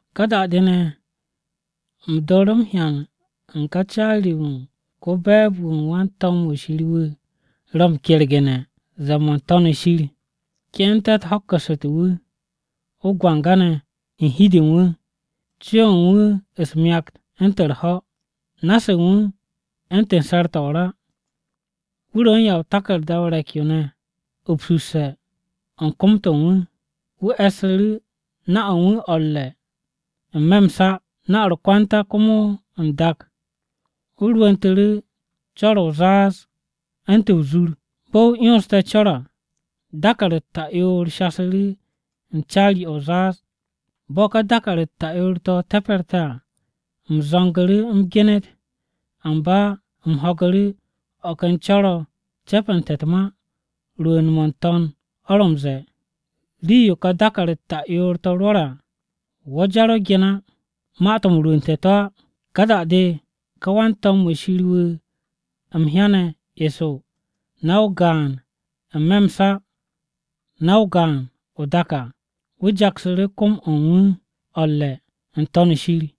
Ka da-de ne̱, u̱m dooru̱ m-hyan u̱n ko-caari-wu̱ u̱n ko-be̱e̱b-wu̱ u̱n wan-to̱m-wu̱ Shir ro̱ m-kergu̱ne̱ ze̱e̱-mo̱ u̱n n-To̱n shir. Ke'ente̱-u̱t ho̱kku̱ssute̱ wu̱, o-gwanga ne̱ u̱n hi-de wu̱. Co-o̱ u̱n wu̱ u̱s-myakt u̱ntu̱n u̱r-ho̱, na-se u̱n wu̱ u̱ntu̱n se̱r-to̱ o-ra. Wu̱ ro̱ u̱n ya o-taku̱rda o-re̱k yo̱ ne̱ upsu̱sse̱ u̱n kom-to̱ u̱n wu̱. Wu̱ e̱ssu̱ru̱ na-o u̱n wu̱ o̱ u̱r-re̱ n-me̱ m-sa, na-o̱ u̱r-kwanta komo o-dak. Wu̱ rwu̱ntu̱ru̱ co̱r-o̱ o-zaaz u̱ntu̱n o-zur. Bo̱ wu̱ 'yonste̱ co̱r à, dàkàr-u̱t ta'yoor shasu̱ru̱ u̱n caari-o̱ o-zaaz. Bo̱ ka dàkàr-u̱t ta'yoor-to̱ te̱pe̱rte̱ à, u̱m zo̱ngu̱ru̱ u̱m genet. Amba u̱m ho̱gu̱ru̱ o̱ ken co̱r-o̱ cepente̱ u̱t-ma rwu̱u̱n-mo̱ n-To̱n o̱ ro̱ m-ze̱e̱, “Rii-yo ka dàkàr-u̱t ta'yoor-to̱ rwo̱re̱ à, wo̱ jar o gen á ma-to̱ m-rwu̱u̱nte̱ to̱ á!” Ka da-de, ka wan-to̱m-wu̱ Shir wu̱ u̱m m-hyane̱ eso na-o gaan n-me̱ m-sa na-o gaan o-dak à, wu̱ jaksu̱ru̱ kom-o̱ u̱n wu̱ o̱ u̱r-re̱ n-To̱n shir.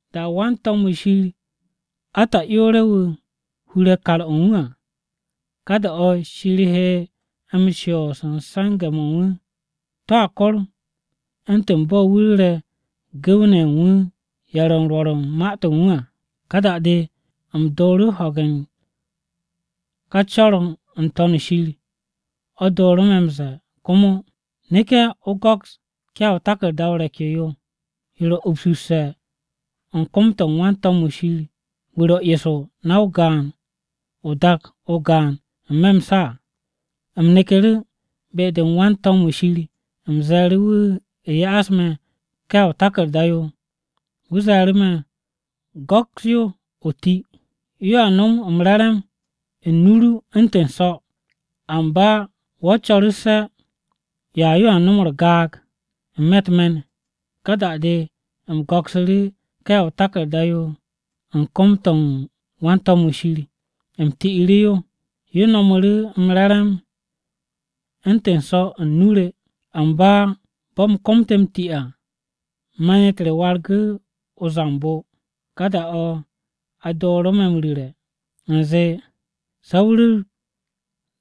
Da-o̱ wan-to̱m-wu̱ Shir ata'yoore̱-wu̱ hure̱ kar-o̱ u̱n wu̱ à, ka da-o̱ Shir he m-shoos u̱n se̱nge̱-mo̱ u̱n wu̱. To̱a kor u̱ntu̱n bo̱ wu̱ ru̱re̱ gu̱w-ne̱ ye̱ u̱n wu̱ ye̱ ro̱ u̱n rwo̱r u̱n ma-to̱ u̱n wu̱ à.” Ka da-de u̱m dooru̱ ho̱ge̱ u̱n ka co̱r-o̱ n-To̱n shir o̱ dooru̱ me̱ ze̱e̱ komo, “Neke̱ o go̱ks ká ya o-taku̱rda o-re̱k yo yo, yo ro̱ upsu̱sse̱ u̱n kom-to̱ u̱n wan-to̱m-wu̱ Shir wu̱ ro̱ eso na-o gaan o-dak o-gaan n-me̱ m-sa à.” U̱m neku̱ru̱ be-de wan-to̱m-wu̱ Shir u̱m ze̱e̱ru̱ wu̱ ya'as me̱ ká ya o-taku̱rda yo. Wu̱ ze̱e̱ru̱ me̱, “Go̱ks yo o ti. Yo a nom m-re̱re̱m u̱n nu-o ru u̱ntu̱n so̱. Amba wo̱ co̱russe̱ ya-yo a nom u̱r-gaag n-me̱ u̱t-me̱n.” Ka da-de u̱m go̱ksu̱ru̱ ká ya o-taku̱rda yo u̱n kom-to̱ u̱n wan-to̱m-wu̱ Shir. U̱m ti'iru̱ yo. Yo no̱mu̱ru̱ m-re̱re̱m u̱ntu̱n so̱ u̱n nu-o re, amba bo̱ u̱m komte̱ m-ti à, me̱n-u̱t re wargu̱ u̱r-gaag. Ka da-o̱ a dooru̱ me̱ m-ru̱re̱ u̱nze, “Se̱ o ru̱r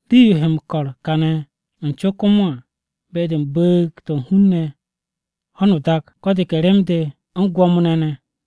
rii-yo he m-ko̱r kane̱ u̱n co komo à be-de u̱n bu̱u̱g-to̱ u̱n hun-ne̱, ho̱n u̱t-dak, ko̱ de ke rem-de, u̱n gwo̱mo-ne̱ ne̱.”